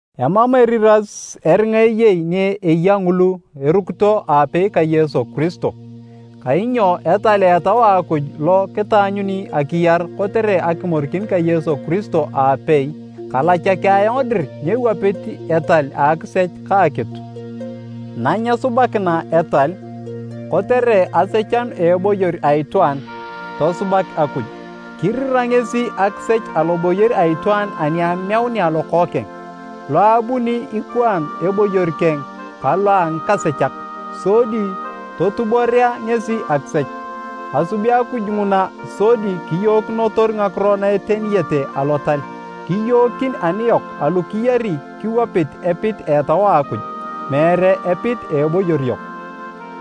Emam eriras eringa eyei ni eya ngulu erukito aapei ka Yesu Kiristo. Kainyo etal a Etau a Akuj lo kitaanyuni akiyar kotere akimorikin ka Yesu Kiristo aapei, kalachaki ayong dir nyewapit etal a akisech ka akitu. Nanyesubakina etal, kotere asechanu a eboyor a itwaan, tosubak Akuj. Kirira ngesi akisech aloboyor a itwaan ani ameunea Lokookeng, lo abuni ikwaan eboyor keng ka lo a ngikasechak, sodi totuborea ngesi akisech. Asubi Akuj nguna sodi kiyookinotor ngakiro na eteniyete Alotal, kiyookin aniyok alu kiyari kiwapit epit a Etau a Akuj, meere epit a eboyor yok.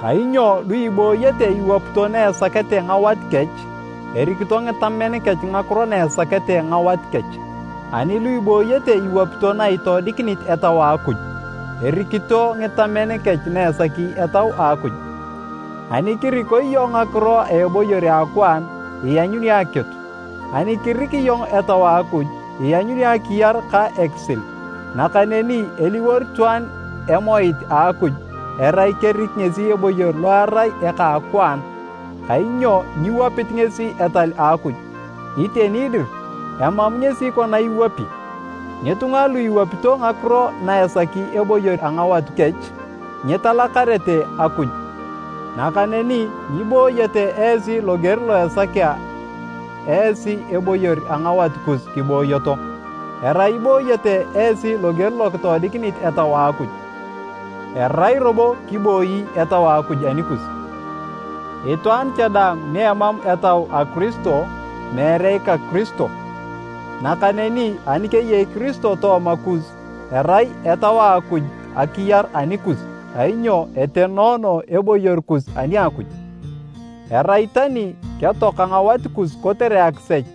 Kainyo lu ibooyete iwapito na esakete ngawat kech, erikito ngitamen kech ngakiro na esakete ngawat kech. Ani lu ibooyete iwapito na itoodikinit Etau a Akuj, erikito ngitamen kech na esaki Etau a Akuj. Ani kiriko iyong ngakiro a eboyor a akwaan, ianyuni akitu. Ani kirik iyong Etau a Akuj, ianyuni akiyar ka ekisil. Nakaneni eliwor itwaan emoit a Akuj, erai kerik ngesi eboyor lo erai eka a akwaan, kainyo nyiwapit ngesi etal a Akuj, iteni dir, emam ngesi kona iwapi. Ngitunga lu iwapito ngakiro na esaki eboyor a ngawat kech, nyitalakarete Akuj. Nakaneni nyibooyete esi loger lo esakea esi eboyor a ngawat kus kibooyoto, erai ibooyete esi loger lo kitoodikinit Etau a Akuj, erai robo kiboi Etau a Akuj anikus. Itwaan cha daang ni emam Etau a Kiristo, meere ika Kiristo. Nakaneni ani keyei Kiristo tooma kus, erai Etau a Akuj akiyar anikus kainyo etenoono eboyor kus ani a Akuj, erai tani ketoaka ngawat kus kotere akisech.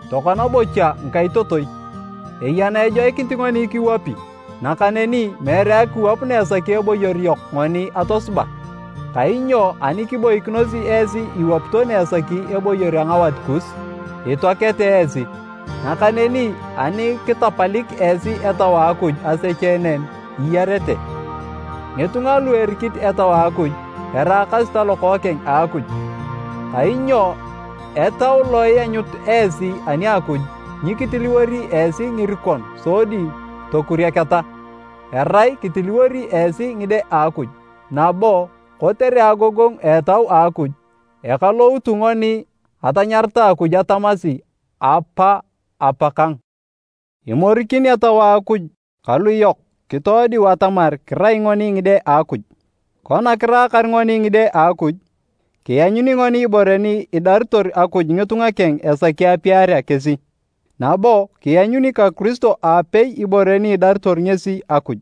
Tokona bocha ngikaitotoi, eya na ejoikinit ngoni kiwapi, nakaneni meere akiwap na esaki eboyor yok ngoni atosuba. Kainyo ani kiboikinosi esi iwapito na esaki eboyor a ngawat kus, itoakete esi. Nakaneni ani kitapalik esi etau a Akuj asecheenen, iyarete. Ngitunga lu erikit Etau a Akuj, eraakasi talokookeng a Akuj. Kainyo Etau lo ianyut esi ani a Akuj nyikitiliwori esi ngirikon sodi tokurieketa, erai kitiliwori esi ngide a Akuj, nabo kotere agogongu a Etau a Akuj, ekaloutu ngoni atanyarata Akuj atamasi, “Apa! Apakang!” Imorikin Etau a Akuj kalu yok kitoodiu atamar kirai ngoni ngide a Akuj. Kona kiraakar ngoni ngide a Akuj, kianyuni ngoni ibore ni idaritor Akuj ngitunga keng esaki apiarea kesi, nabo kianyuni ka Kiristo aapei ibore ni idaritor ngesi Akuj.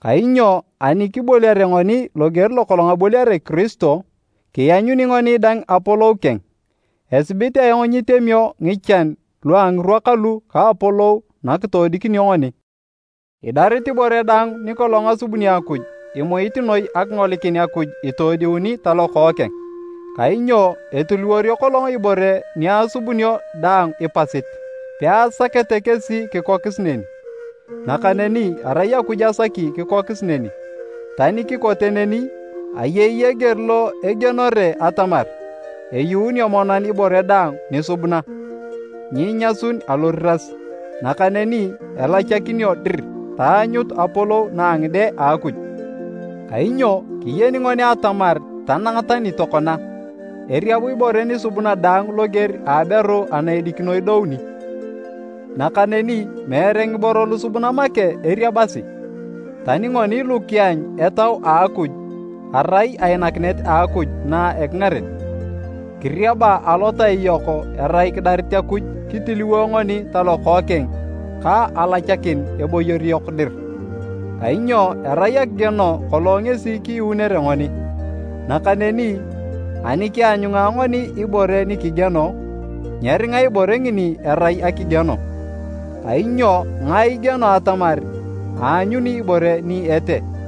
Kainyo ani kiboliare ngoni loger lokolong aboliare Kiristo, kianyuni ngoni dang apolou keng. Esibit ayong nyitemio ngichan lua ngirwa kalu ka apolou nakitoodikinio ngoni. Idarit ibore daang nikolong asubuni Akuj imuit noi akingolikin Akuj itoodiuni talokookeng. Kainyo etiliworio kolong ibore ni asubunio daang ipasit, peasakete kesi kikokis neni, nakaneni arai Akuj asaki kikokis neni. Tani kikote neni, ayei eger lo egienore atamar eyuunio monan ibore daang nisubuna, nyinyasun aloriras, nakaneni elachakinio dir taanyut apolou na a ngide a Akuj. Kainyo kiyeni ngoni atamar tanang tani tokona, eriab ibore nisubuna daang loger a aberu ana edikino idouni. Nakaneni meere ngiboro lusubuna make eriabasi, tani ngoni lu kianyu Etau a Akuj erai ainakinet a Akuj na ekingaren, kiriaba alotai yok erai kidarit Akuj kitiliwo ngoni talokookeng ka alachakin eboyor yok dir. Kainyo erai akigieno kolong ngesi kiyuunere ngoni, nakaneni ani kianyunga ngoni ibore ni kigieno, nyeringa ibore ngini erai akigieno, kainyo ngae igieno atamar aanyuni ibore ni etee?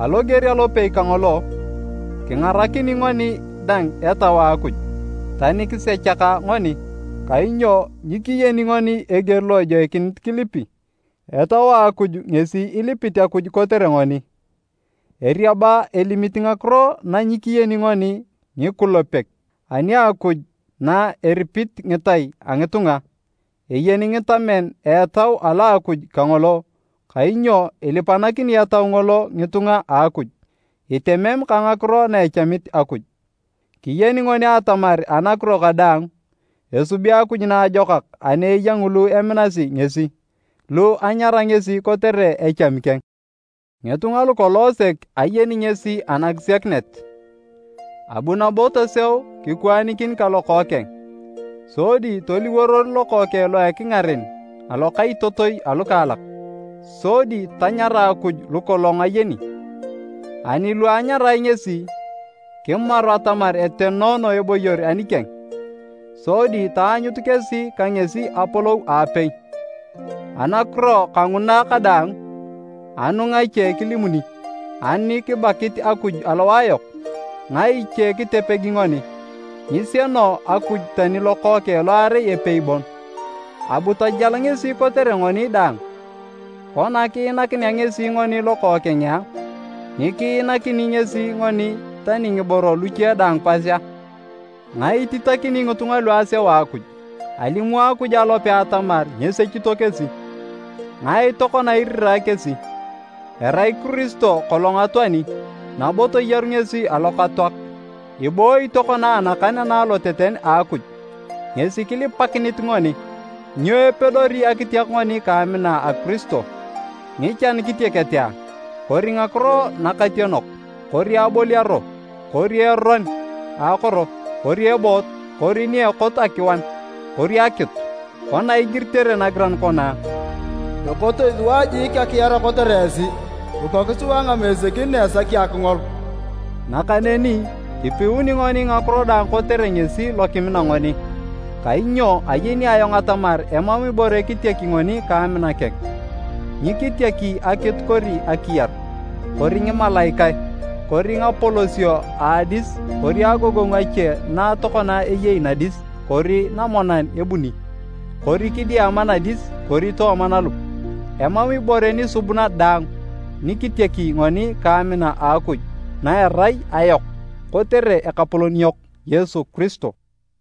Aloger alopei kangolo, kingaranakini ngoni dang Etau a Akuj, tani kisechaka ngoni, kainyo nyikiyeni ngoni eger lo ejoikinit kilipi, Etau a Akuj ngesi ilipit Akuj kotere ngoni, eriaba elimit ngakiro na nyikiyeni ngoni ngikulepek. Ani Akuj na eripit ngitai a ngitunga, eyeni ngitamen a Etau alo a Akuj kangolo, kainyo ilipanakini Etau ngolo ngitunga a Akuj, itemem ka ngakiro na echamit Akuj. Kiyeni ngoni atamar anakiro kadaang, esubi Akuj naajokak ani eya ngulu eminasi ngesi, lu anyara ngesi kotere echami keng. Ngitunga lukolong sek ayeni ngesi ankisiakinet, abu nabo toseu kikwaanikin ka Lokookeng. Sodi toliworor Lokookeng lo a ekingaren, alokaitotoi alukaalak. Sodi tanyara Akuj lukolong ayeni. Ani lu anyarae ngesi, kimaru atamar etenoono eboyor anikeng, sodi taanyut kesi ka ngesi apolou aapei. Anakiro kanguna kadaang, anu ngache kilimuni? Ani kibakit Akuj alowae yok, ngae iche kitepegi ngoni? Nyisieno Akuj tani Lokookeng lo arai epei bon, abu tajal ngesi kotere ngoni daang! Kona kiinakinea ngesi ngoni Lokookeng a, nyikiinakini ngesi ngoni tani ngiboro luche daang pas a? Ngae ititakini ngitunga lu aseu Akuj? Alimu Akuj alope atamar nyesechito kesi! Ngae tokona irirae kesi? Erai Kiristo kolong atoani, nabo toyaru ngesi alokatoak, ibooyi tokona anakan ana aloteten a Akuj. Ngesi kilipakinit ngoni! Nyo epedori akitiak ngoni ka amina a Kiristo? Ngichan kitiakete a? Kori ngakiro nakationok, kori aboliaro, kori eron a akoro, kori eboot, kori ni ekot akiwan, kori akitu? Kona igiritere nagiran kona, “Ekotoi sua jiik akiar kotere esi, kikok sua ngamesekin na esakio akingol.” Nakaneni kipiuni ngoni ngakiro daang kotere ngesi lo kimina ngoni! Kainyo ayeni ayong atamar emam ibore kitiaki ngoni ka amina keng, nyikitiaki akitu kori akiyar, kori ngimalaikae, kori ngapolosio a adis kori agogongu ache na tokona eyei nadis kori namonan ebuni, kori kidiama nadis kori tooma nalup, emam ibore nisubuna daang nikitiaki ngoni ka amina a Akuj na erai ayok kotere Ekapolon yok Yesu Kiristo.